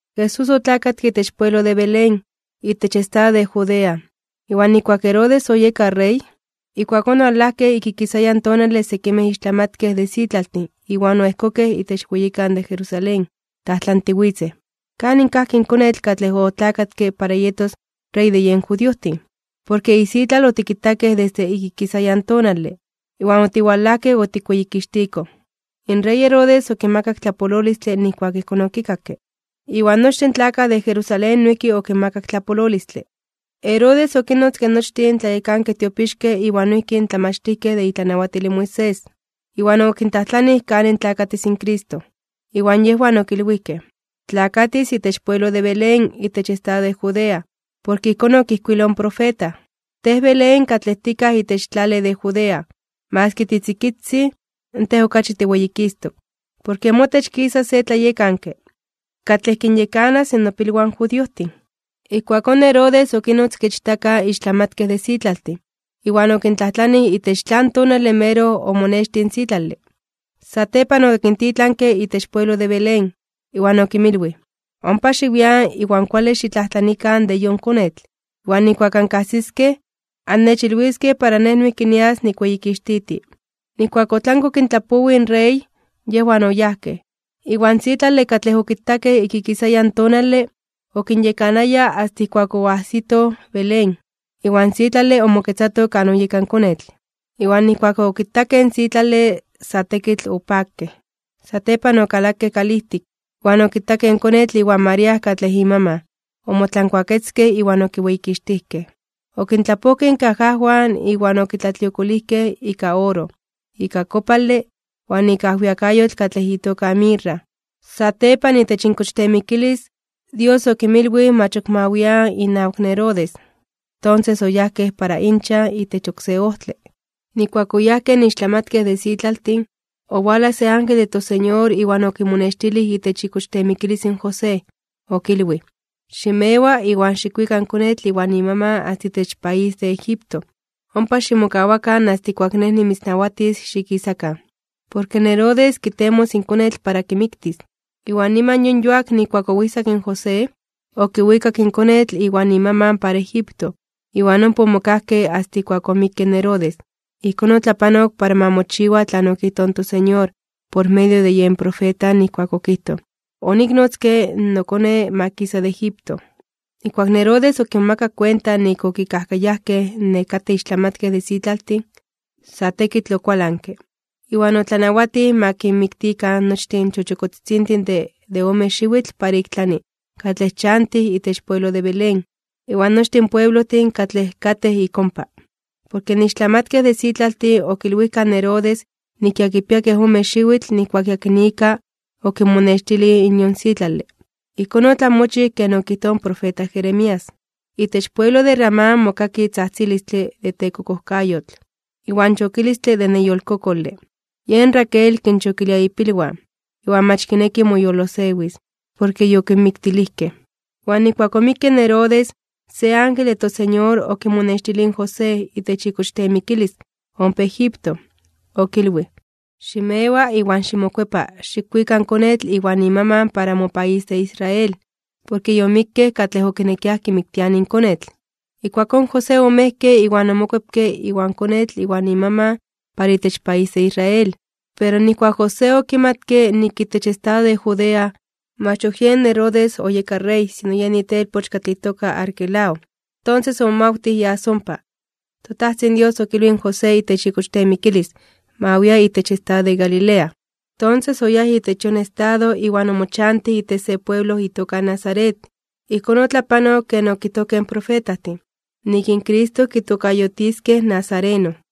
Jesús otlakatke itech pueblo de Belén, itech estado de Judea, iwan nijkuak Herodes oyeka rey. Ijkuakón owalajkej ik ikisayan tonale sekimej ixtlamatkej de sitlaltin iwan oejkokej itech weyikan de Jerusalén. Tlajtlantiwitzej: ―¿Kanin kajki in konetl katlej otlakatke para yetos Rey de yen judiojtin? Porke isitlal otikitakej desde ik ikisayan tonale, iwan otiwalajkej otikweyikixtikoj. In rey Herodes okimakak tlapololistle nijkuak ijkón okikakke, iwan nochtin tlakaj de Jerusalén noijki okinmakak tlapololistle. Herodes okinnotzke nochtin tlayekankej tiopixkej iwan noijki in tlamachtijkej de itlanawatil in Moisés. Iwan okintlajtlanij kanin tlakatis in Cristo. Iwan yejwan okilwijkej: ―Tlakatis itech pueblo de Belén itech estado de Judea. Porke ijkón okijkuiloj in profeta: Tej, Belén, katlej tikaj itech tlale de Judea, maski titzikitzin, tej okachi tiweyikistok (tiweyititok). Porke motech kisas se tlayekanke, katlej kinyekanas nopilwan judiojtin. Ijkuakón Herodes okinnotzke ichtaka in ixtlamatkej de sitlaltin, iwan okintlajtlanij itech tlan tonale meroj omonextij in sitlale. Satepan okintitlanke itech pueblo de Belén, iwan okinmilwij: ―Ompa xiwian, iwan kuale xitlajtlanikan de yon konetl. Iwan nijkuak ankajsiskej, annechilwiskej, para nej noijki nias nikweyikixtiti. Nijkuak otlanke okintlapowij in rey, yejwan oyajkej. Iwan sitlale katlej okitakej ik ikisayan in tonale, okinyekanaya asta ijkuak oajsitoj Belén, iwan sitlale omoketzato kan oyeka in konetl. Iwan nijkuak okitakej in sitlale sa tekitl opakej. Satepan okalakej kalijtik, iwan okitakej in konetl iwan María katlej imaman. Omotlankuaketzkej iwan okiweyikixtijkej. Okintlapojkej inkajajwan iwan okitlatliokolijkej ika oro, ika kopale, iwan ika ajwiakayotl katlej itoka mirra. Satepan, itech inkochteemikilis, Dios okinmilwij mach ok ma wian inawak Herodes. Tonses, oyajkej para inchan itech oksé ojtle. Nijkuak oyajkej in ixtlamatkej de sitlaltin, ijkuakón, owalaj se ángel de toSeñor iwan okimonextilij itech ikochteemikilis in José. Okilwij: ―Ximewa, iwan xikwika in konetl iwan imaman asta itech país de Egipto. Ompa ximokawakan asta ijkuak Nej nimitznawatis xikisakan. Porke Herodes kitemos in konetl para kimiktis. Iwan niman yon yuak nijkuak oijsak in José, okiwikak in konetl iwan imaman para Egipto. Iwan ompa omokajkej asta ijkuak omikke in Herodes. Ijkón otlapanok para ma mochiwa tlan okijtoj in toSeñor por medio de yen profeta nijkuak okijtoj: “Oniknotzke in noKone ma kisa de Egipto.” Nijkuak in Herodes okimomakak kuenta nik okikajkayajkej in nekatej ixtlamatkej de sitlaltin, sa tekitl okualanke, iwan otlanawatij ma kinmiktikan nochtin in chochokotzitzintin de ome xiwitl para ik tlani katlej chantij itech pueblo de Belén, iwan nochtin in pueblojtin katlej katej ik ompa. Porke in ixtlamatkej de sitlaltin okilwijkaj in Herodes nik ya kipia kej ome xiwitl nijkuak yakinika okinmonextilij in yon sitlale. Ijkón otlamochij ken okijtoj in profeta Jeremías: Itech pueblo de Ramá mokaki tzajtzilistle de tekokojkayotl, iwan chokilistle de neyolkokole. Yen Raquel kinchokilia ipilwan, iwan mach kineki moyolosewis, porke yokinmiktilijkej. Iwan nijkuak omikke in Herodes, se ángel de toSeñor okimonextilij in José itech ikochteemikilis ompa Egipto. Okilwij: ―Ximewa, iwan ximokuepa xikwika in konetl iwan imaman para mopaís de Israel. Porke yomikkej katlej okinekiaj kimiktianij in konetl. Ijkuakón José omejke iwan omokuepke iwan konetl iwan imaman para itech país de Israel. Pero nijkuak José okimatke nik itech estado de Judea, mach ok yen Herodes oyeka rey sino yen itelpoch katlej itoka Arquelao, tonses omomawtij yas ompa. ToTajtzin Dios okilwij in José itech ikochteemikilis, ma wia itech estado de Galilea. Tonses, oyáj itech yon estado iwan omochantij itech se pueblo itoka Nazaret. Ijkón otlapanok ken okijtojkej in profetajtin, nik in Cristo kitokayotiskej nazareno.